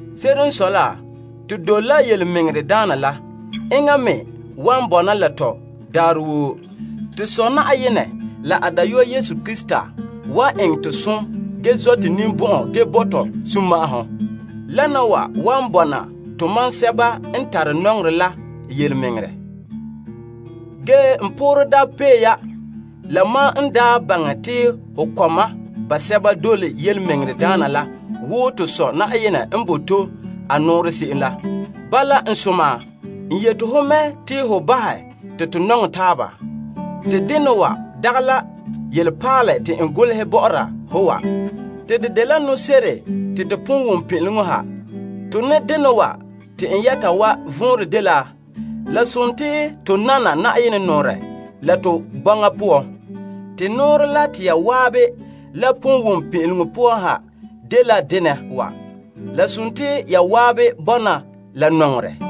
Se'ere n sɔe la to dole la yelemɛŋɛrɛ la ge enŋa me wan bɔna la tɔ daarɛ woo. To Sɔ' Yenɛ la a Dayɔa Yesu Krista tare zo'ohogɔ ge zɔ' to ninbɔn'ɔn ge bo to sunma'ahom. Wana wa wan bɔna tomam sɛba n tare nɔŋerɛ la yelemɛŋɛrɛ. N poorɛ daa pee ya la mam n daa baŋɛ te ho kɔma basɛba dole yelemɛŋɛrɛ la wo to Sɔ' Na'ayenɛ n bo to a nɔɔrɛ se'em la. Bala, n soma, n yeti ho mɛ te ho bahɛ te to nɔŋɛ taaba. Te dena wa dagɛ la yelepaalɛ te n golehɛ bɔ'ɔra ho wa. Te dela nɔse'ere te to pon wom pin'ileŋɔ ha. Te nɔŋdena wa te n yɛta wa vɔnrɛ dela to nana a nɔɔrɛ la to bɔŋa poan. Te nɔɔrɛ la te ya zan'an la pon wom pin'ileŋɔ poan ha dela dena wa: ya zan'an bɔna la nɔŋerɛ.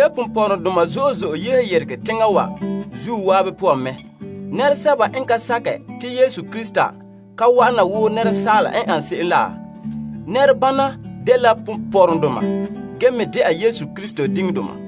Ponpɔrɔŋdoma zo'e zo'e yehe yeregɛ teŋa wa zuo zan'an poan mɛ. Nɛresɛba n ka sakɛ te Yesu Krista ka wa'ana wo nɛresaala n ane se'em la. Nɛrebana dela ponpɔrɔŋdoma ge me dɛna Krista diŋdoma.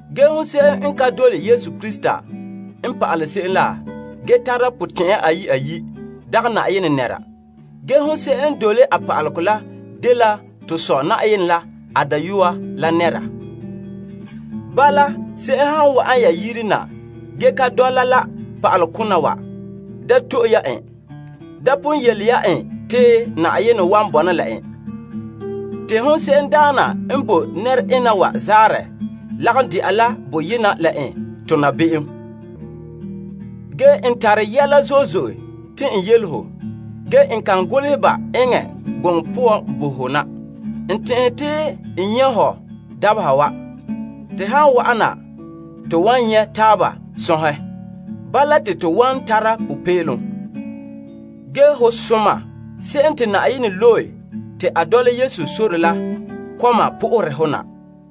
Ge nɛrese'em n ka dole Yesu Krista n pa'alɛ se'em la, ge tara potɛn'ya ayi' ayi', dagɛ Yenɛ nɛra. Ge nɛrese'em n dole a pa'alegɔ la dela to Sɔ' la a Dayɔa la nɛra. Bala, se'em han wa'an ya yire na ge ka dɔla la pa'alekona wa, da to'e ya en. Da pon yele ya en te sunma'ahom wan bɔna la en. Te nɛrese'em daana n bo nɛra ena wa zaanrɛ lagom de'a la boyena la en tona be'em. N tare yɛla zo'e zo'e te n yele ho, ge n kan golehɛ ba eŋɛ gɔŋɔ poan bo ho na. N tɛn'ɛhe te n nyɛ' ho dabeha wa. Te han wa'ana, to wan nyɛ' taaba sɔnhɛ. Bala, te to wan tara popeelom. Ge ho soma se'em te Yenɛ loe te a dɔla Yesu sore la kɔma po'ohere ho na.